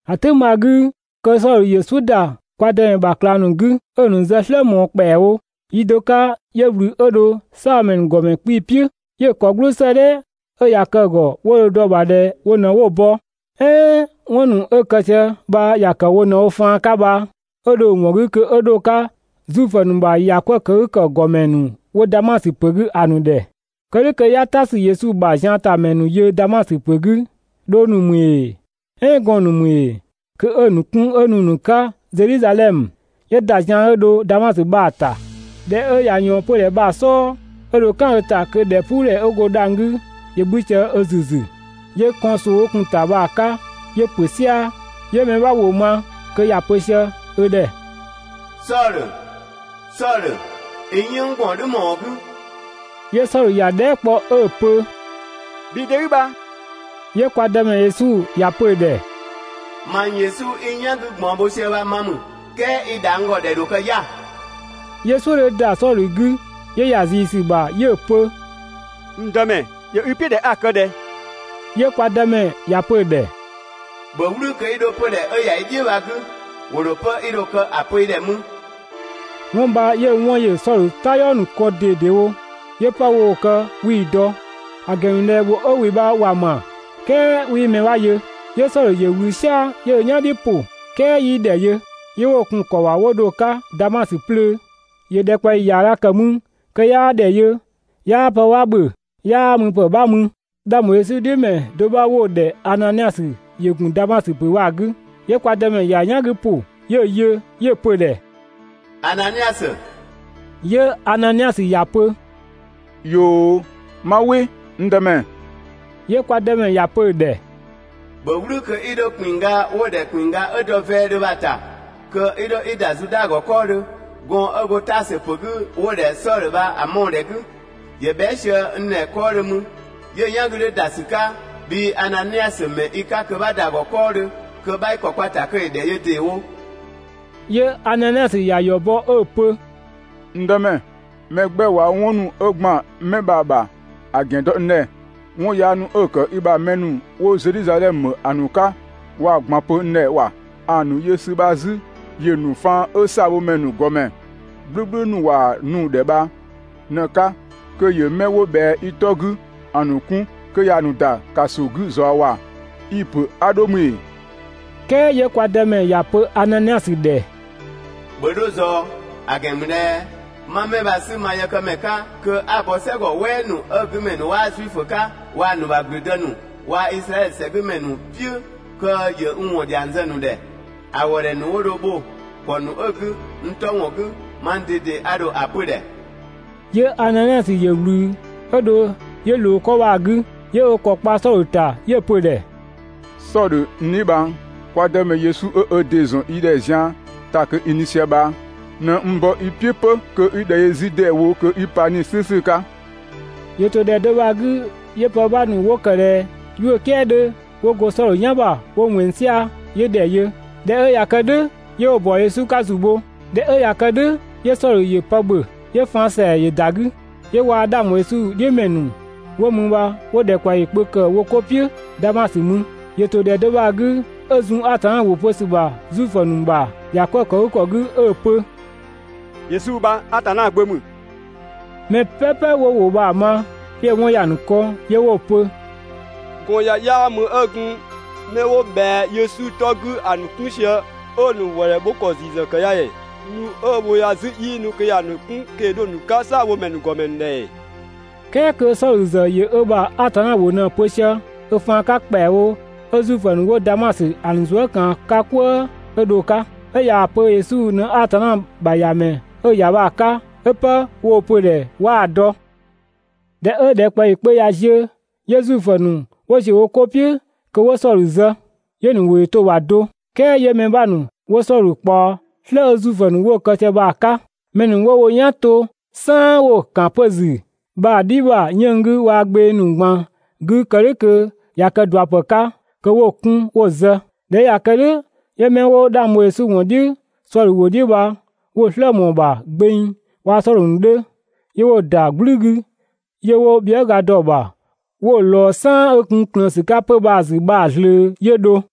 ‑A "tʋ̈ng bha‑ 'gü, kö Sɔdhö ‑yö "suʋ̈ ‑da kwa Dëmɛ ‑bha ꞊klang ‑nu 'gü, 'ö‑ ‑nu zë "slë ꞊mɔɔ ‑kpɛawo. Yi do 'ka 'yö ꞊wlü 'ö dho "saabhomɛ ‑nu ‑gɔmɛ 'kpii‑ "piʋ̈, 'yö‑ ‑kɔ "gblʋʋ 'sëëdhɛ ('ö ꞊ya kë‑ ‑gɔ 'wo dho‑ dɔ‑ ‑bha ꞊dhɛ wo ꞊në 'wo‑ bɔ, "ɛɛn 'wɔn ‑nu 'ö‑ kë sië bha ‑ya ‑kë wo ꞊në wo faan 'ka bha) 'ö dho‑ ‑wɔn 'gü kö 'ö 'dho‑ 'ka Zuifö ‑nu ‑bha ‑yakwëëkëgükɔ ‑gɔmɛ ‑nu 'wo Damasö ‑pö 'gü ‑a ‑nu ‑dhɛ. Kë "dhʋ̈ kö 'ya "ta ‑sü Yesu ‑bha ziantamɛ ‑nu yö Damasö ‑pö 'gü, dhong ‑nu ‑mü ‑ee "ɛɛn gɔɔn‑ ‑nu ‑mü ‑ee, kö 'ö‑ ‑nu 'kun 'ö nu‑ ‑nu 'ka Zedhizadhɛmö. 'Yö ‑da zian 'ö dho Damasö bha‑ ‑ta. ꞊Dhɛ 'ö ꞊ya ꞊yɔɔn 'pödhɛ bha‑ "sɔɔ, 'ö dho "kan ö ‑ta kö ‑dhɛpuudhɛ 'ö go dhang‑ 'gü ‑yö 'bhü sië ö ‑züzü. 'Yö kɔn ꞊soo 'ö gun‑ ‑ta bha‑ 'ka 'yö ‑pö "sia‑, 'yö mɛ 'bha ‑wʋ ma kö ‑ya pö sië ö ‑dhɛ: «Sɔdhö, Sɔdhö, i n "yënng ꞊gbaɔn "dhʋ̈ ‑më ‑wɔn 'gü?» 'Yö Sɔdhö ‑ya dhɛɛ" kpɔ 'ö‑ pö: «Bhii 'de 'i bha?» 'Yö kwa Dëmɛ Yesu ‑ya pö‑ ‑dhɛ: «Mang Yesu 'i n "yan 'gü ꞊gbaɔn bho sië bha ma ‑mü, ["kɛɛ i ‑dha n ‑gɔ ‑dhɛ ‑dho kë 'ya‑.» 'Yö "suʋ̈ 'dhö ‑da Sɔdhö 'gü, 'yö ‑ya ꞊zii ‑sü ‑bha 'yö‑ pö: «N Dëmɛ, ‑yö i "piʋ̈ ꞊dhɛ 'a‑ kë ꞊dhɛ?» 'Yö kwa Dëmɛ ‑ya pö‑ ‑dhɛ:] «‑Bhö "wlü kö 'i 'dho 'pödhɛ 'ö ‑ya i "dhiʋ̈ bha‑ 'gü! ‑Wo ‑dho 'pë 'i dho‑ kë ‑a pö i ‑dhɛ mü.» 'Wɔn bha 'yö‑ 'wɔn ‑yö Sɔdhö "tayɔɔ ‑nu kɔn ꞊dedewo 'yö 'pë woo‑ kë 'wii‑ dɔ, ‑a ‑gɛn ‑mü ꞊dhɛ ‑wʋ 'ö ‑wɩ bha ‑wa ‑ma, "kɛɛ 'wii mɛ 'bha yö. 'Yö Sɔdhö ‑yö ꞊wlü "sia‑ 'yö ö "yan "dhiʋ̈ ‑pʋ, "kɛɛ 'yii ‑dhɛ yö. 'Yö 'wo‑ kun‑ ‑kɔ ‑bha 'wo dho‑ 'ka Damasö 'plöö. ‑Yö ‑dhɛkpaɔyi ‑yaaga ‑kë mü kö 'yaa ‑dhɛ yö, 'yaa pë 'bha ‑bhö, 'yaa müpë 'bha mü. 'Dhang ‑bho Yesu "dhiʋ̈ ‑mɛ do bha 'wo‑ ‑dhɛ Ananiasö ‑yö ‑gun Damasö ‑pö bha‑ 'gü. 'Yö kwa Dëmɛ ‑ya "yan 'gü ‑pʋ, 'yö‑ yö, 'yö‑ pö‑ ‑dhɛ: «Ananiasö!» 'Yö Ananiasö ‑ya pö: «꞊Yoo, 'ma "wɩ, n Dëmɛ!» 'Yö kwa Dëmɛ ‑ya pö‑ ‑dhɛ: «‑Bhö "wlü kö 'i 'dho ‑kpinngga 'wo‑ ‑dhɛ ‑kpinngga 'ö dɔ vɛɛdhö bha‑ ‑ta kö 'i 'dho 'i ‑da Zuda ‑gɔ 'kɔɔdhö, gɔɔn‑ 'ö go Taasö ‑pö 'gü 'wo‑ ‑dhɛ Sɔdhö bha‑ mɔɔ‑ ‑dhɛ 'gü! ‑Yö bhɛa" sië n ‑dhɛ 'kɔɔdhö mü. 'Yö‑ "yan 'gü 'dhö ‑da ‑sü 'ka bhii Ananiasö ‑mɛ i 'ka kö 'bha ‑da ‑gɔ 'kɔɔdhö kö 'bha i ‑kɔ kpa‑ ‑ta kö ‑yö ‑dhɛ yö ‑deewo.» 'Yö Ananiasö ‑ya ‑yɔ bɔ 'ö‑ pö: «N Dëmɛ, mɛ 'gbɛ ꞊wa 'wɔn ‑nu 'ö ‑gban gɔndënë bha‑ ‑bha ‑a ‑gɛn dɔ n ‑dhɛ, 'wɔn yaa ‑nu 'ö‑ ‑kë i ‑bha mɛ ‑nu 'wo Zedhizadhɛmö ‑a ‑nu 'ka ꞊waa‑ ꞊gban pö n ‑dhɛ ‑wa! ‑A ‑nu yö ‑sü bha 'zü ‑yö ‑nu faan 'ö "saabhomɛ ‑nu ‑gɔmɛ "gblʋ̈gblʋ̈ ‑nu ‑wa nu‑ ‑dhɛ bha ꞊në‑ 'ka kö ‑yö 'mɛ 'wo ꞊bhɛa i 'tɔ 'gü ‑a ‑nu 'kun kö ‑ya ‑nu ‑da ‑kaso 'gü ꞊zɔɔ ‑wa! (I‑ ‑pö 'a 'dho mü ‑ee?) "Kɛɛ 'yö kwa Dëmɛ ‑ya pö Ananiasö ‑dhɛ: «‑Bhö 'dho ꞊zɔɔ, ‑a ‑gɛn ‑mü ꞊dhɛ 'ma 'mɛ bha‑ 'sü ma yëkëmɛ 'ka kö 'a‑ bɔ "sɛgɔ "wɛɛ ‑nu 'ö‑ 'gü ‑mɛ ‑nu 'waa Zuifö 'ka waa‑ ‑nu ‑bha ‑gblüdë ‑nu waa‑ Izraɛdhö ‑sɛ 'gü ‑mɛ ‑nu "piʋ̈ kö ‑yö n ‑wɔn ‑dhiang zë‑ ‑nu ‑dhɛ. ‑A ‑wëëdhɛ ‑nu dho bho‑ ‑kɔ ‑nu ö‑ 'gü n 'tɔ ‑wɔn 'gü, mang ꞊dede a ‑dho ‑a pö‑ ‑dhɛ.» 'Yö Ananiasö ‑yö ꞊wlü 'ö dho 'yö ꞊loo 'kɔ bha‑ 'gü, 'yö ö ‑kɔ kpa Sɔdhö ‑ta 'yö‑ pö‑ ‑dhɛ: «Sɔdhö n dheebhang, kwa Dëmɛ Yesu 'ö ö ‑dɩ ‑zɔn i ‑dhɛ zian ‑ta kö i nu sië bha ꞊në n bɔ i "piʋ̈ 'pö kö 'i ‑dhɛ yö 'zü ‑deewo kö i pa 'Nii‑ "slʋ̈ʋ̈slʋ̈ 'ka.» ‑Yö ‑to ‑dhɛ do bha‑ 'gü, 'yö pë 'bha ‑nu 'wo ‑kë ꞊dhɛ 'yuʋ̈‑ "kɛɛ 'dhö 'wo go Sɔdhö "yan ‑bha 'wo ꞊wɛnng "sia‑, 'yö ‑dhɛ yö, ꞊dhɛ 'ö ꞊ya kë "dhʋ̈, 'yö 'wo‑ ‑bɔ Yesu 'ka ‑zu bho. ꞊Dhɛ 'ö ꞊ya kë "dhʋ̈ 'yö Sɔdhö ‑yö pë ‑bhö, 'yö‑ faan ‑sɛa ‑yö ‑da 'gü. 'Yö waa‑ 'dhang ‑bho Yesu "dhiʋ̈ ‑mɛ ‑nu 'wo mü bha 'wo ‑dhɛkpaɔyi kpö ‑kë wo 'ko "piʋ̈ Damasö mü. ‑Yö ‑to ‑dhɛ do bha‑ 'gü 'ö zun Atanna ‑wʋ pö ‑sü ‑bha Zuifö ‑nu ‑bha ‑yakwëëkëgükɔ ‑nu 'gü 'ö‑ pö: «Yesu bha Atanna Gbö ‑mü.» Mɛ "pɛpɛ 'wo‑ ‑wʋ bha‑ ma 'yö‑ 'wɔn ‑ya ‑nu kɔn 'yö 'wo‑ pö: «Gɔɔn‑ ya 'yaa mü 'ö gun 'mɛ 'wo ꞊bhɛa Yesu 'tɔ 'gü ‑a ‑nu 'kun sië 'ö‑ ‑nu ‑wëëdhɛ bho ‑kɔ ‑ziisü ‑kë ya ‑ee? Nu 'ö‑ wo ya 'zü 'yii nu kö ‑ya ‑nu 'kun kö ‑yö 'dho‑ ‑nu 'ka "saabhomɛ ‑nu ‑gɔmɛ ‑nu ‑dhɛ ‑ee?» "Kɛɛ kö Sɔdhö ‑zë ‑yö ö ‑bha Atanna ‑wʋ ꞊në‑ pö sië ö faan 'ka ‑kpɛawo 'ö Zuifö ‑nu 'wo Damasö ‑a ‑nu zuë" ꞊kaan‑ 'ka "kwëë 'ö dho‑ 'ka, 'ö ꞊yaa‑ pö Yesu ꞊në Atanna ‑bha ‑Yamɛ 'ö‑ ‑ya bha‑ 'ka, 'ö 'pë woo‑ pö‑ ‑dhɛ 'waa‑ dɔ. ꞊Dhɛ 'ö ‑dhɛkpaɔyi kpö ꞊ya ziö, 'yö Zuifö ‑nu 'wo ‑ziö wo 'ko "piʋ̈ kö 'wo Sɔdhö zë. 'Yö‑ ‑nu ‑wʋ ‑yö to‑ ‑bha do, "kɛɛ 'yö mɛ 'bha ‑nu 'wo Sɔdhö ꞊kpaɔ "slë 'ö Zuifö ‑nu 'wo‑ kë sië bha‑ 'ka. Mɛ ‑nu ‑wo wo "yan ‑to "saan 'wo‑ ‑kan 'pö‑ ‑zü bha‑ "dhi ‑bha 'yënng‑ 'gü waa‑ gbeng ‑nu ꞊gban 'gü kë "dhʋ̈ kö ꞊ya kë ꞊dua ‑pë 'ka, kö 'wa‑ 'kun 'wo‑ zë. ꞊Dhɛ 'ö ꞊ya kë "dhʋ̈ 'yö 'mɛ 'wo 'dhang bho Yesu ‑wɔn "dhiʋ̈ Sɔdhö ‑wʋ "dhiʋ̈ bha 'wo‑ "slë ꞊mɔɔ‑ ‑bha gbeng, waa‑ Sɔdhö ‑nu 'dhö, 'yö 'wo‑ ‑da "gblü 'gü, 'yö 'wo bhiëga dɔ‑ ‑bha 'wo‑ ꞊lɔɔ "saan ('ö gun ꞊klëën ‑sü 'kaa 'pö‑ bha‑ ‑zü bha‑) ꞊zlöö 'yö dho.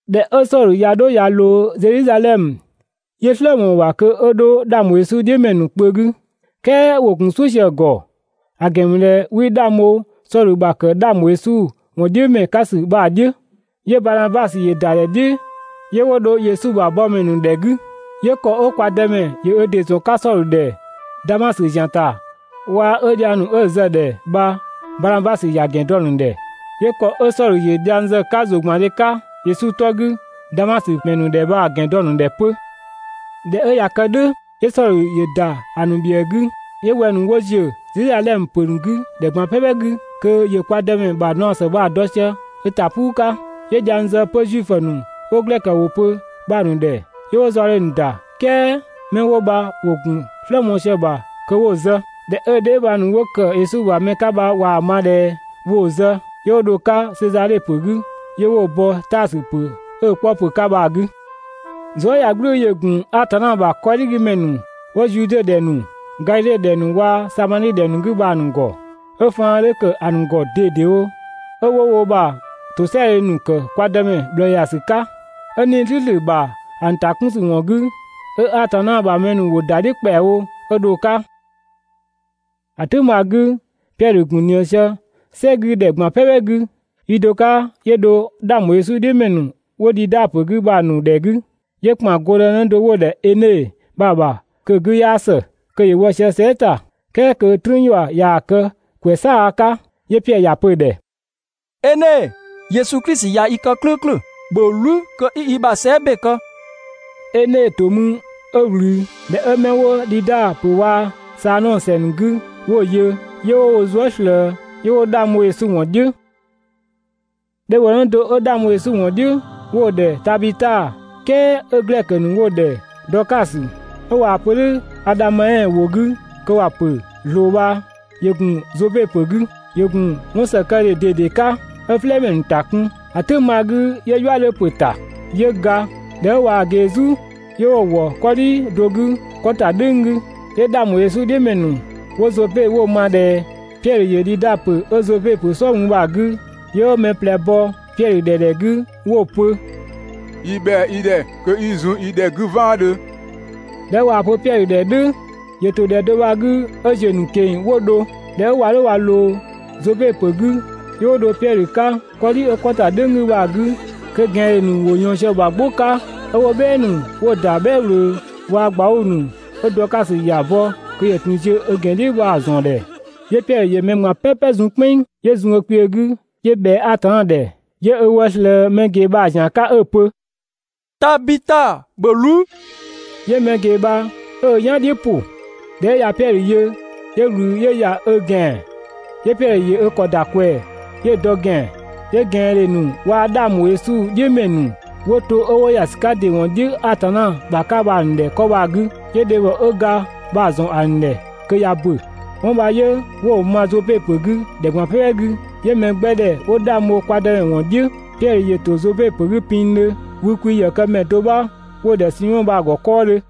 ꞊Dhɛ 'ö Sɔdhö ꞊ya 'dho ꞊ya ꞊loo Zedhizadhɛmö, 'yö "slë ꞊mɔɔ‑ ‑bha kö 'ö 'dho 'dhang ‑bho Yesu "dhiʋ̈ ‑mɛ ‑nu kpö 'gü, "kɛɛ ‑wo ‑gun "suʋ̈ sië‑ ‑gɔ, ‑a ‑gɛn ‑mü ꞊dhɛ 'wii 'dhang bho Sɔdhö ‑bha ‑kë 'dhang ‑bho Yesu ‑wɔn "dhiʋ̈ ‑mɛ 'ka ‑sü bha‑ "dhiʋ̈. 'Yö Baanabasö ‑yö ‑da ‑dhɛ "dhiʋ̈ 'yö 'wo dho Yesu ‑bha yëkëmɛ ‑nu ‑dhɛ 'gü. 'Yö ‑kɔ 'ö kwa Dëmɛ ‑yö ö ‑dɩ ‑zɔn 'ka Sɔdhö ‑dhɛ Damasö ‑zian ‑ta waa‑ 'ö dhiang ‑nu 'ö‑ zë‑ ‑dhɛ bha Baanabasö ‑ya ‑gɛn dɔ‑ ‑nu ‑dhɛ. 'Yö ‑kɔ 'ö Sɔdhö ‑yö dhiang zë‑ 'ka ‑zʋgbandhe 'ka Yesu 'tɔ 'gü Damasö ‑mɛ ‑nu ‑dhɛ bha‑ ‑gɛn dɔ‑ ‑nu ‑dhɛ 'pö. ꞊Dhɛ 'ö ꞊ya kë "dhʋ̈, 'yö Sɔdhö ‑yö ‑da ‑a ‑nu ‑bhiëë 'gü, 'yö wɛng‑ ‑nu 'wo ‑ziö Zedhizadhɛmö ‑pö 'gü ‑dhɛ ꞊gban "pɛpɛ 'gü kö ‑yö kwa Dëmɛ ‑bha ꞊naɔ ‑së bha‑ dɔ sië ö ‑ta "puu 'ka. 'Yö dhiang zë 'pö Zuifö ‑nu 'wo glɛkö ‑wʋ pö bha‑ ‑nu ‑dhɛ, 'yö 'wo zaɔdhe ‑nu ‑da, "kɛɛ 'mɛ 'wo bha ‑wo ‑gun "slë mɔɔ‑ sië‑ ‑bha kö 'wo‑ zë. ꞊Dhɛ 'ö‑ dheebhang ‑nu 'wo ‑kë Yesu ‑bha mɛ 'ka bha ꞊waa‑ ma ꞊dhɛ woo‑ zë, 'yö 'wo dho‑ 'ka Sezadhe ‑pö 'gü 'yö 'wo‑ bɔ Taasö ‑pö 'ö‑ 'kpɔ ‑pö 'ka bha‑ 'gü. Zuëyagblʋ̈ʋ̈‑ ‑yö ‑gun Atanna ‑bha 'kɔdhigümɛ ‑nu 'wo Zude ‑dhɛ ‑nu, Gadhidhe ‑dhɛ ‑nu waa‑ Samadhi ‑dhɛ ‑nu 'gü bha‑ ‑nu ‑gɔ, 'ö faan 'dhö ‑kë ‑a ‑nu ‑gɔ ꞊dedewo, 'ö 'wo wo ‑bha ‑tosɛadhe ‑nu ‑kë kwa Dëmɛ ꞊bhlëë ‑ya ‑sü 'ka. 'Ö 'Nii‑ "slʋ̈ʋ̈slʋ̈ ‑bha ‑a ‑nu ‑ta 'kun ‑sü ‑wɔn 'gü, 'ö Atanna ‑bha mɛ ‑nu ‑wo ‑da "dhiʋ̈ ‑kpɛawo 'ö dho‑ 'ka. ‑A "tʋ̈ng bha‑ 'gü, Piɛdhö ‑gun ꞊nië sië "sɛ 'gü ‑dhɛ ꞊gban "pɛpɛ 'gü. Yi do 'ka 'yö dho 'dhang ‑bho Yesu "dhiʋ̈ ‑mɛ ‑nu 'wo Dhida ‑pö 'gü bha‑ ‑nu ‑dhɛ 'gü. 'Yö ‑kpan gɔndënë do 'wo‑ ‑dhɛ Ene bha‑ ‑bha kö‑ 'gü 'yaa ‑së, kö ‑yö wɔ sië sɛɛ" ‑ta, "kɛɛ kö "trüün ‑yua ꞊yaa‑ kë ‑kwɛ "saaga 'ka. 'Yö Piɛdhö ‑ya pö‑ ‑dhɛ: «Ene, Yesu Klisi ꞊ya i kë "klʋ̈ʋ̈klʋ̈! ‑Bhö "wlü kö 'i i ‑bha sɛɛ" ‑be kë!» Ene ‑to mü 'ö ꞊wlü. ꞊Dhɛ 'ö 'mɛ 'wo Dhida ‑pö bha waa‑ Saadhɔng ‑sɛ ‑nu 'gü 'wo‑ yö, 'yö 'wo wo zuë" ꞊slëë, 'yö 'wo 'dhang bho Yesu ‑wɔn "dhiʋ̈. Dhebhɔnë do 'ö 'dhang bho Yesu ‑wɔn "dhiʋ̈ 'wo‑ ‑dhɛ Tabita, "kɛɛ 'ö glɛkö ‑nu 'wo‑ ‑dhɛ Dɔɔkasö ('ö ꞊waa‑ pö "dhʋ̈ Adhameɛn ‑wʋ 'gü kö ‑wa ‑pö ꞊zloo bha), ‑yö ‑gun Zope ‑pö 'gü. ‑Yö ‑gun 'wɔn ‑sëkëdhe ꞊dede 'ka, 'ö "flɛɛmɛ ‑nu ‑ta kun. ‑A "tʋ̈ng bha‑ 'gü 'yö "yua 'dhö ‑pö ‑ta, 'yö ga. ꞊Dhɛ 'ö ꞊waa‑ ꞊gee "zu, 'yö 'wo‑ ‑wɔ 'kɔdhi do 'gü 'kɔ ‑ta "dhʋ̈ng 'gü. 'Yö 'dhang ‑bho Yesu "dhiʋ̈ ‑mɛ ‑nu 'wo Zope 'wo‑ ma ꞊dhɛ Piɛdhö ‑yö Dhida ‑pö 'ö Zope ‑dhɛ "sɔɔ mü bha‑ 'gü. 'Yö 'wo mɛ ꞊plɛ bɔ Piɛdhö ‑dhɛ ‑dhɛ 'gü 'wo‑ pö: «Yi ‑bhɛa i ‑dhɛ kö 'i zun yi ‑dhɛ 'gü "vaandhö!» ꞊Dhɛ 'ö ꞊waa‑ pö Piɛdhö ‑dhɛ "dhʋ̈, ‑yö ‑to ‑dhɛ do bha‑ 'gü 'ö ‑ziö ‑nu ꞊keng‑ 'wo dho. ꞊Dhɛ 'ö ꞊wa ꞊loo Zope ‑pö 'gü, 'yö 'wo dho Piɛdhö 'ka 'kɔdhi 'ö 'kɔ ‑ta "dhʋ̈ng 'gü bha‑ 'gü, kö ꞊gɛandhe ‑nu ‑wo ꞊yɔɔn sië‑ ‑bha "gbʋ 'ka, 'ö 'wo "bhɛɛ ‑nu 'wo‑ ‑da "bhɛɛ ꞊wlöö waa‑ ꞊gbauu‑ ‑nu 'ö Dɔɔkasö ‑ya bɔ kö ‑yö ‑tun ꞊kö ziö ö ‑gɛn "dhiʋ̈ bha‑ ‑zɔn ‑dhɛ. 'Yö Piɛdhö ‑yö mɛ ꞊gban "pɛpɛ zun "kpɛnng, 'yö zun ö kpiö 'gü 'yö ꞊bhɛa Atanna ‑dhɛ, 'yö ö wë ꞊slëë mɛ ꞊gee bha‑ ‑zian 'ka 'ö‑ pö: «Tabita, ‑bhö "wlü!» 'Yö mɛ ꞊gee bha 'ö ö "yan "dhiʋ̈ ‑pʋ. ꞊Dhɛ 'ö ꞊ya Piɛdhö yö, 'yö ꞊wlü 'ö ‑ya ö ‑gɛan. 'Yö Piɛdhö ‑yö ö ‑kɔ ‑da ꞊kwɛɛ‑ 'yö‑ dɔ ‑gɛan, 'yö ꞊gɛandhe ‑nu waa‑ 'dhang ‑bho Yesu "dhiʋ̈ ‑mɛ ‑nu 'wo to 'ö 'wo ‑ya ‑sü 'ka ‑dɩ ‑wɔn "dhiʋ̈ Atanna ‑bha 'ka bha‑ ‑nu ‑dhɛ 'kɔ bha‑ 'gü, 'yö dhebhɔ 'ö ga bha‑ ‑zɔn ‑a ‑nu ‑dhɛ kö ꞊ya ‑bö. 'Wɔn bha 'yö 'wo‑ ma Zope ‑pö 'gü ‑dhɛ ꞊gban "pɛpɛ 'gü, 'yö mɛ 'gbɛ ‑dhɛ 'wo 'dhang bho kwa Dëmɛ ‑wɔn "dhiʋ̈. Piɛdhö ‑yö ‑to Zope ‑pö 'gü pinngdhö wükwi ‑yëkëmɛ do 'bha 'wo‑ ‑dhɛ Simɔ bha‑ ‑gɔ 'kɔɔdhö.